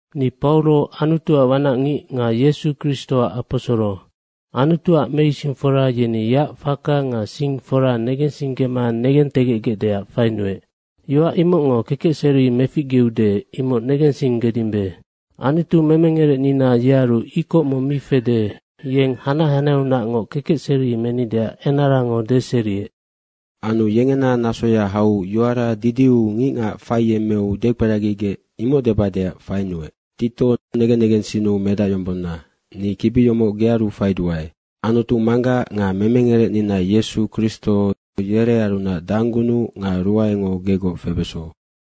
Ni Pauro, Anutuac wanacngic nga Yesu Kristoac aposoro. Anutuac meisingfora yeni yeac faka nga sing fora negensinggema negentegecgecdeac fainuec. Yoac imocngo kekecseri meficgeude, imoc negensinggedimbe. Anutu memengerecnina yearu ikoc mong mi fede, yeng hanac hanaheaunacngoc kekecseri menideac enarango deseriec. Anu yengena nasoya hau yoara didiu ngicngac faiyemmeu dekperagigec, imoc debadeac fainuec. Tito, negen negensinnu medacyombonna, ni kibi yomoc gearu faiduae. Anutu Manggac nga memengerecnina Yesu Kristo yerearunac danggunuc nga ruaengo gegoc febeso.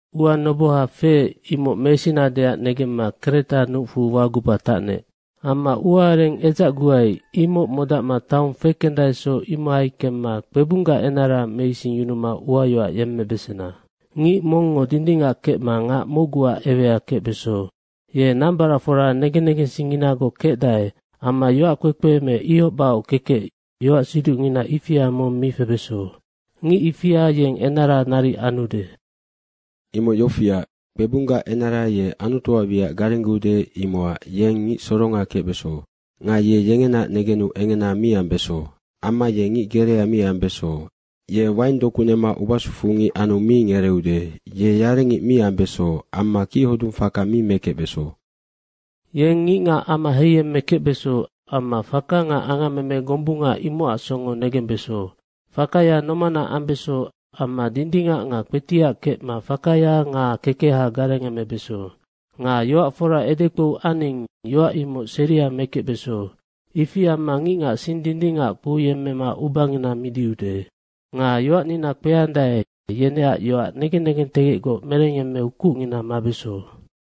Ua noboha feec, imoc mesinadeac negemma Kreta nucfu waguba tacnec. Amma ua areng edzacguai, imoc modacma taong fekendaesoc, imohai kemma kpebunggac enara meisingyunuma uayoac yemmebesena. Ngic mongngo dindingac kecma ngac mocguac ewea kecbeso. Ye nambaracfora negen negensingnginagoc kecdae amma yoackpekpe me ihoc bahoc kekec, yoacsiducngina ifia mong mi febeso. Ngic ifia yeng enara naric anude. Imoc yofiac, kpebunggac enara ye Anutuac wiac garenggeude, imocac yeng ngic soronga kecbeso. Nga ye yengenaac negenu engena mi ambeso. Amma ye ngic gerea mi ambeso. Ye waing doku nema ubasufu ngic anu mi ngereeude. Ye yarengic mi ambeso amma kichodung faka mi mekecbeso. Yeng ngicngac ama heiyemmekecbeso amma faka nga angammeme gombunga, imocac songo negembeso. Fakaya nomana ambeso amma dindingac nga kpetiac kecma fakaya nga kekeha garengemebeso. Nga yoac fora edekpou aning, yoac imoc seria mekecbeso. Ifi amma ngicngac sing dindingac kpouyemmema ubangina midiude. Nga yoacnina kpeandae, yeneac yoac negen negentegecgoc merengyemmeu kucngina mabeso.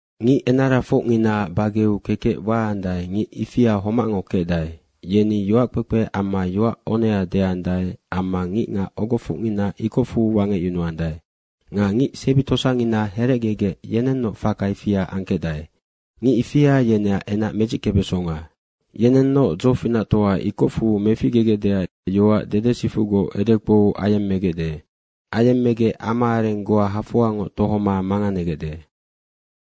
Ngic enarafocnginaac bageu kekec waandae, ngic ifia homacngo kecdae. Yeni yoackpekpe amma yoac onea deandae amma ngicngac ogofocngina ikocfu wangecyunuandae. Nga ngic sebi tosangina herecgegec, yenennoc faka ifia angkecdae. Ngic ifia yeneac enac medzickebesonga. Yenennoc dzofinactoa ikocfu meficgegecdeac yoac dedesifucgoc edekpou ayemmegecde. Ayemmegec ama areng goa hafoangoc tohoma manganegecde.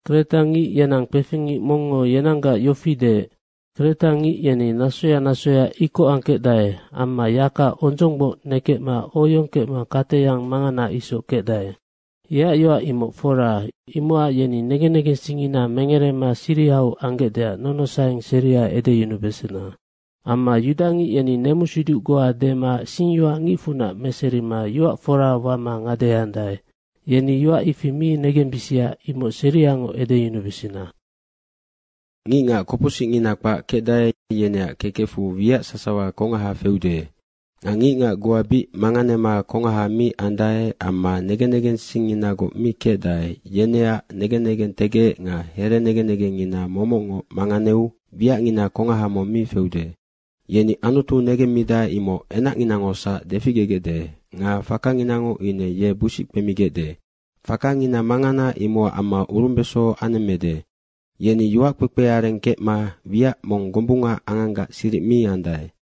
Kreta ngic yenang kpefing ngic mongngo yenanggac yofi deec, “Kretangic yeni nasoya nasoya ikoc angkecdae amma yaka ondzonggboc nekecma oyong kecma kateyang mangana isoc kecdae.” Yeac yoac imoc fora, imocac yeni negen negensingngina mengerema sirihau anggecdeac nonosaeng seria edeyunubesena. Amma yudangic yeni nemusiduc goa dema singyoac ngicfunac meserima yoac fora wama ngadeheandae. Yeni yoac ifi mi negembisia, imoc seriangoc edeyunubesena. Nga ngicngac kopocsicngina kpac kecdae, yeneac kekecfu wiac sasawa kongaha feude. Nga ngicngac goa bic manganema kongaha mi andae amma negen negensingnginagoc mi kecdae, yeneac negen negentegec nga herenegen negengngina momocngoc manganeu wiacngina kongaha mong mi feude. Yeni Anutu negemmidae, imoc enacnginangosac deficgegecde nga fakanginango ine ye busic kpemigecde. Fakangina mangana imocac amma urumbeso anemmede. Yeni yoac kpekpeareng kecma wiac mong gombunga anganggac siric mi andae.